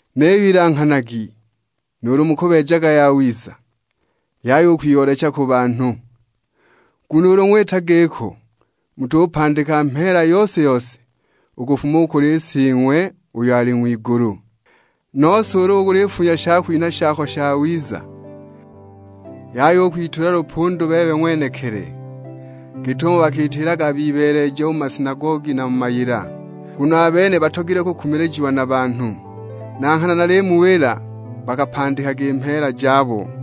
"Niyo ilanghanagi nuulu mukubeejaga yawiza, yaya u kwiyoolecha ku banhu; nguno ulu ng'wita giko mutupandika mheela yose-yose u kufuma u kuli Sing'we uyo ali ng'wigulu. Nose ulu ulifunya shakwinha shako shawiza, yaya u kwitulila lupundu bebe ng'wenekili, git'umo bakiitilaga bibeeleja mu masinagogi na mu mayila. Nguno a bene batogilwe kukumilijiwa na banhu. Na nghana nalimuwila bakapandikaga i mheela jabo.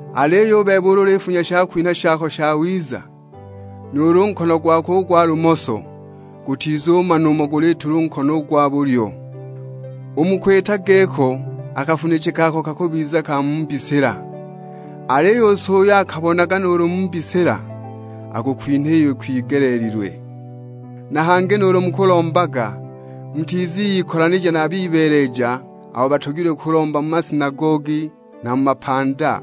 Aliyo u bebe ulu ulifunya shakwinha shako shawiza, nuulu nkono gwako u gwa lumoso gutizumana umo guliitila u nkono u gwa bulyo. U mu kwita giko a kafunije kako kakubiza ka mu mbisila, aliyo u So uyo akabonaga nuulu mu mbisila akukwinha iyo ikwigeleelilwe." "Na hangi nuulu mukulombaga mutiziikolanija na bibeeleja abo batogilwe kulomba mu masinagogi na mu mapanda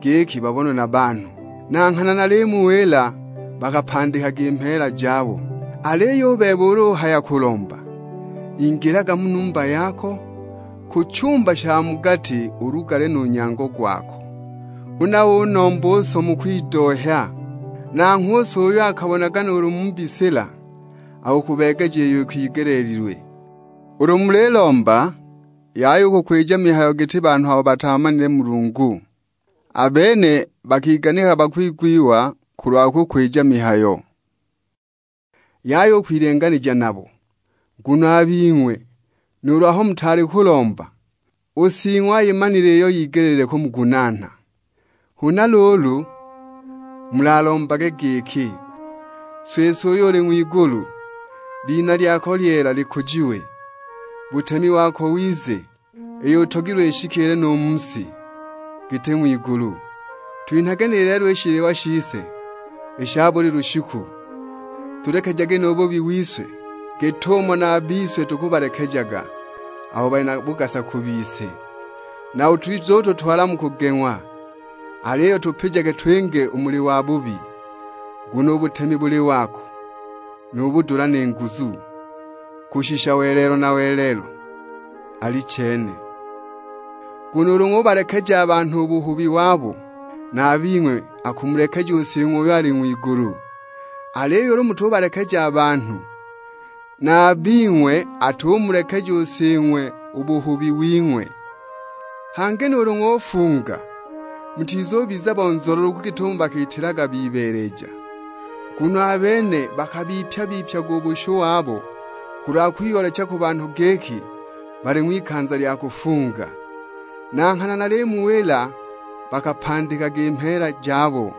giki babonwe na banhu; na nghana nalimuwila bakapandikaga i mheela jabo. Aliyo u bebe ulu uhaya kulomba, ingilaga mu numba yako, ku chumba sha mu gati ulugale nu nyango gwako, huna unombe u So mu kwidohya. Nanghwe u So uyo akabonaga nuulu mu mbisila akukubeegeja iyo ikwigeleelilwe. Ulu mulilomba, yaya u kukwija mihayo giti banhu abo bataamanile Mulungu; a bene bakiganikaga bakwigwiwa kulwa kukwija mihayo. Yaya u kwilenganija nabo, nguno a bing'we nuulu aho mutaali kulomba, u Sing'we ayimanile iyo yigelile kumugunaana. Huna luulu, mulalombage giki, 'Siswe uyo uli ng'wigulu, lina lyako lyeela likujiwe. Butemi wako wize, iyo utogilwe ishikiile nu mu si, giti ng'wigulu. Twinhage ni lelo i shiliwa shise i sha buli lushiku. Tulekejage nu buhubi wise, git'umo na a bise tukabalekejaga abo bali na bugasa ku bise. Na utizututwala mu kugeng'wa, aliyo tupijage twinge u muli Wabubi. [Nguno u butemi buli wako, nu budula ni nguzu; kushisha welelo na welelo, Alichene].' Nguno ulu ng'ubalekeja a banhu u buhubi wabo, na a bing'we akumulekeja u Sing'we uyo ali ng'wigulu. Aliyo ulu mutubalekeja a banhu, na a bing'we atumulekeja u Sing'we u buhubi wing'we." "Hangi nuulu ng'ufunga, mutizubiza bonzololoku git'umo bakiitilaga bibeeleja. Nguno a bene bakibipya-bipyaga u bushu wabo kulwa kwiyoolecha ku banhu giki bali ng'wikanza lya kufunga. Na nghana nalimuwila bakapandikaga i mheela jabo.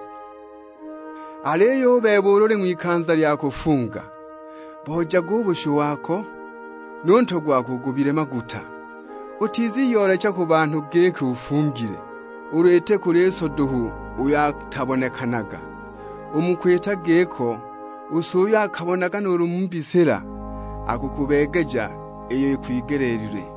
Aliyo u bebe ulu uli ng'wikanza lya kufunga, boojage u bushu wako; nu ntwe gwako ugubile maguta. Utiziyoolecha ku banhu giki ufungile, ulu iti kuli So duhu uyo atabonekanaga. U mu kwita giko u So uyo akabonaga nuulu mu mbisila, akukubeegeja iyo ikwigeleelilwe."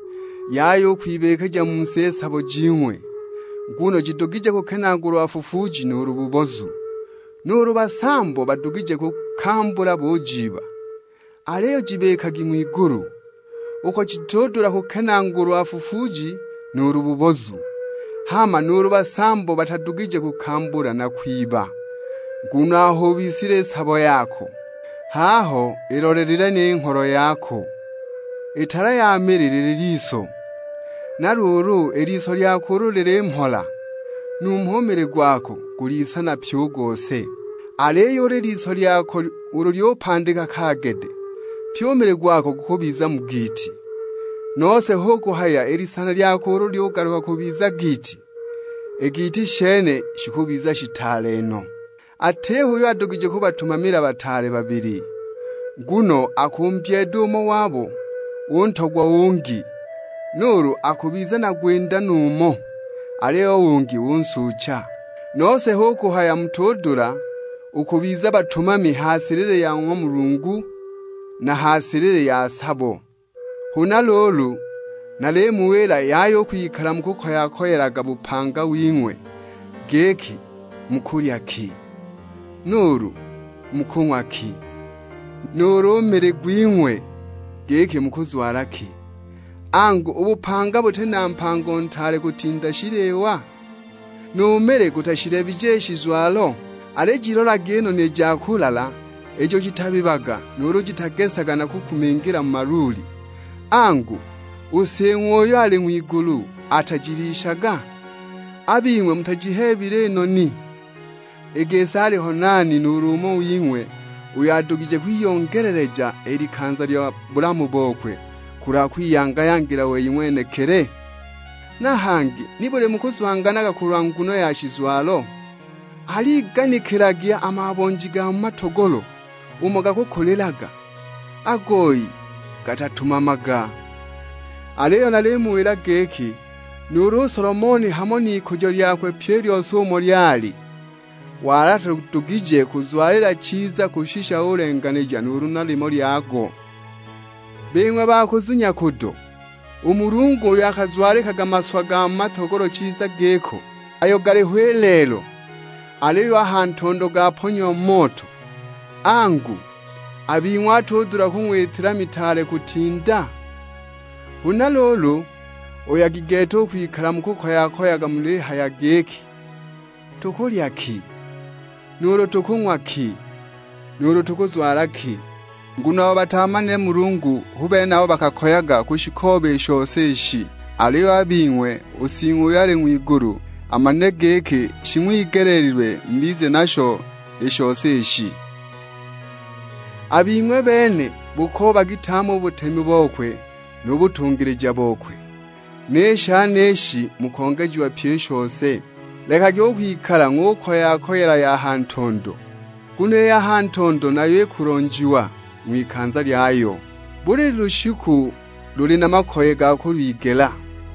"Yaya u kwibikija mu si i sabo jing'we, nguno jidugije kukenaagulwa fufuuji nuulu bubozu; nuulu basambo badugije kukambula bujiiba. Aliyo jibikagi ng'wigulu, uko jitudula kukenaagulwa fufuuji nuulu bubozu; hama nuulu basambo batadugije kukambula na kwiba. Nguno aho ubisilile sabo yako, h'aho ilolelile ni ngholo yako." "I tala ya mili lili liso, na luulu i liso lyako ulu lili mhola, numho u mili gwako guli n'isana pyi u gose. Aliyo i liso lyako ulu lyupandika kaagede, pyi u mili gwako gukubiza mu giiti. Nose hu kuhaya i lisana lyako ulu lyugaluka kubiza giiti, i giiti shene shikubiza shitaale no!" "Atiho uyo adugije kubatumamila bataale babili; nguno akumbyeeda umo wabo, untogwa u ungi; nuulu akubiza na gwinda nu umo, aliyo u ungi unsuucha. Nose hu kuhaya mutudula u kubiza batumami ha silili ya ng'wa Mulungu, na ha silili ya sabo!" "Huna luulu, nalimuwila yaya u kwikala mukukoya-koyelaga bupanga wing'we, giki mukulya ki, nuulu mukung'wa ki; nuulu mili gwing'we, giki mukuzwala ki. Angu, u bupanga buti na mpango ntaale kutinda shiliwa? Nu mili gutashiheebile i shizwalo? Alijilolagi i noni ja kulala ijo jitabibaga nuulu jitagesaga na kukumingila mu maluuli; angu, u Sing'we uyo ali ng'wigulu, atajilishaga? A bing'we mutajiheebile i noni? I gisi aliho nani nuulu umo wing'we uyo adugije kwiyongeleleja i likanza lya bulamu bokwe kulwa kwiyanga-yangila wei ng'wenekili? Na hangi nibuli mukuzwanganaga kulwa nguno ya shizwalo? Aligiganikilagi a mabonji ga mu matogolo umo gakakulilaga, a goyi gatatumamaga, nuulu shizwalo gatabeejaga. Aliyo nalimuwila giki nuulu u Solomoni hamo n'ikujo lyakwe pyi i lyose umo lyali, wali atadugije kuzwalila chiza kushisha ulenganila nuulu na limo lyago. Bing'we ba kuzunya kudo, u Mulungu uyo akazwalikaga maswa ga mu matogolo chiza giko, ayo galiho i lelo, aliyo a ha ntondo gaponyiwa mu moto; angu, a bing'we atudula kung'witila mitaale kutinda? "Huna luulu, oyagi gete u kwikala mukukoya-koyaga mulihaya giki, 'Tukulya ki'; nuulu, 'Tukung'wa ki;' nuulu, 'Tukuzwala ki!' Nguno abo bataamanile Mulungu hu bene abo bakakoyaga kushikooba i shose ishi; aliyo a bing'we, u Sing'we uyo ali ng'wigulu amanile giki shing'wigeleelilwe mubize nasho i shose ishi. A bing'we bene bukoobagi tame u butemi bokwe nu butungilija bokwe, ni shenishi mukongejiwa pyi i shose. Lekagi u kwikala ng'ukoya-koyela ya ha ntondo, nguno i ya ntondo nayo ikulonjiwa ng'wikanza lyayo; buli lushiku luli na makoye ga kulwigela."